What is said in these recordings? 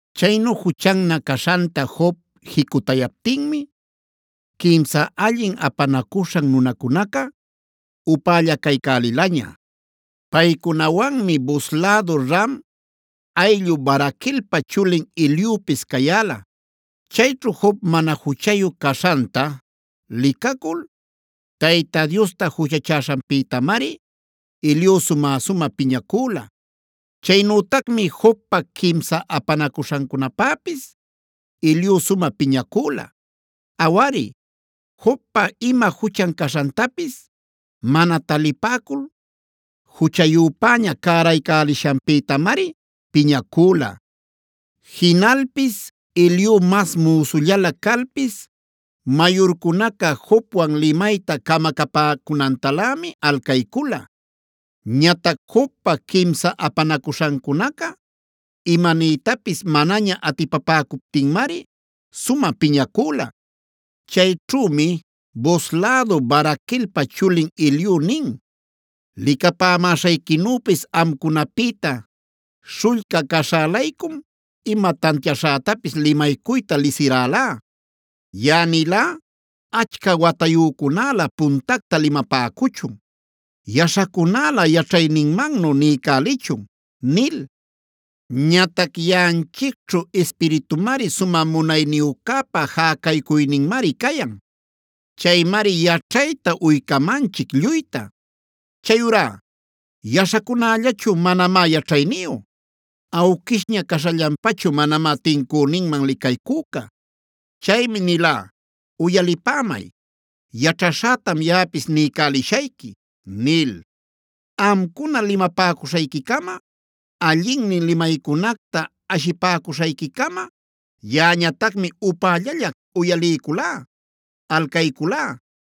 Chaynu juchannä caśhanta Job jicutayaptinmi quimsan allin apanacuśhan nunacunaca upällacaycälilaña. Paycunawanmi Buz lädu Ram ayllu Baraquelpa chulin Eliupis cayäla. Chayćhu Job mana juchayu caśhanta licacul Tayta Diosta juchachäśhanpïtamari Eliu sumä-sumä piñacüla. Chaynütacmi Jobpa quimsan apanacuśhancunapäpis Eliu sumä piñacüla; Awari, Jobpa ima juchan caśhantapis mana talipäcul juchayüpäña cäraycälishanpïtamari piñacüla. Jinalpis Eliu mas müsullalä calpis mayurcunaca Jobwan limayta camacapäcunantalämi alcaycula. Ñatac Jobpa quimsan apanacuśhancunaca imaniytapis manaña atipapäcuptinmari sumä piñacüla. Chayćhümi Buz lädu Baraquelpa chulin Eliu nin: “Licapamäśhayquinüpis amcunapïta śhullca caśhä-laycum ima tantiaśhätapis limalcuyta lisirälá. Yaꞌa nilá: ‘Achca watayücunälä puntacta limapäcuchun; yaśhacunälä yaćhayninmannu niycälichun’ nil. Ñatac yaꞌanchicćhu ispiritumari, Sumä Munayniyücäpa jäcaycuyninmari cayan. Chaymari yaćhayta uycamanchic lluyta. Chayurá yaśhacunällachu manamá yaćhayniyu; awquishña caśhallanpachu manamá tincüninman licaycüca. Chaymi nilá: ‘Uyalipämay, yaćhaśhätam yaꞌapis niycälishayqui’ nil. “Amcuna limapäcuśhayquicama, allinnin limaycunacta ashipäcuśhayquicama, yaꞌañatacmi upällalla uyaliyculá, alcayculá.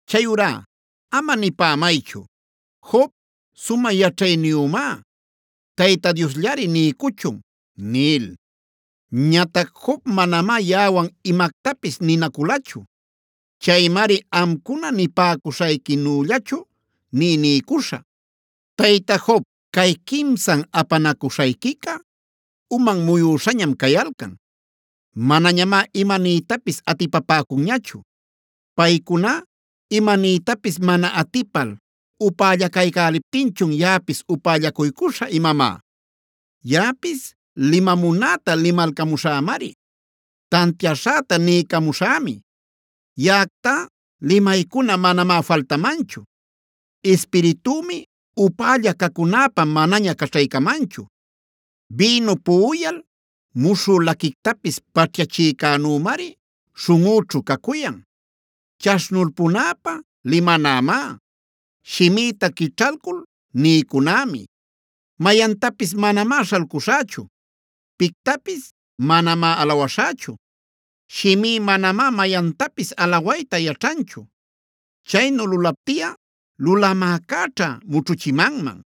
Chayurá ama nipämaychu: ‘Job sumä yaćhayniyümá; Tayta Diosllari niycuchun’ nil. Ñatac Job manamá yaꞌawan imactapis ninaculachu. Chaymari amcuna nipäcuśhayquinüllachu nï niycuśhä. “Tayta Job, cay quimsan apanacuśhayquica uman muyüśhañam cayalcan; manañamá imaniytapis atipapäcunñachu. ¿Paycuna imaniytapis mana atipal upällacaycäliptinchun yaꞌapis upällacuycuśhä imamá? Yaꞌapis limamunäta limalcamuśhämari; tantiaśhäta niycamuśhämi. Yaꞌactá limaycuna manamá faltamanchu; ispiritümi upälla cacunäpä manaña caćhaycamanchu. Bïnu puꞌuyal muśhü laquictapis paćhyachicänümari śhunꞌüćhu cacuyan. Chaśhnulpunäpä limanämá; shimïta quićhalcul niycunämi. Mayantapis manamá śhalcuśhächu; pictapis manamá alawaśhächu. Shimí manamá mayantapis alawayta yaćhanchu; chaynu lulaptiꞌa Lulamäcäćha mućhuchimanman.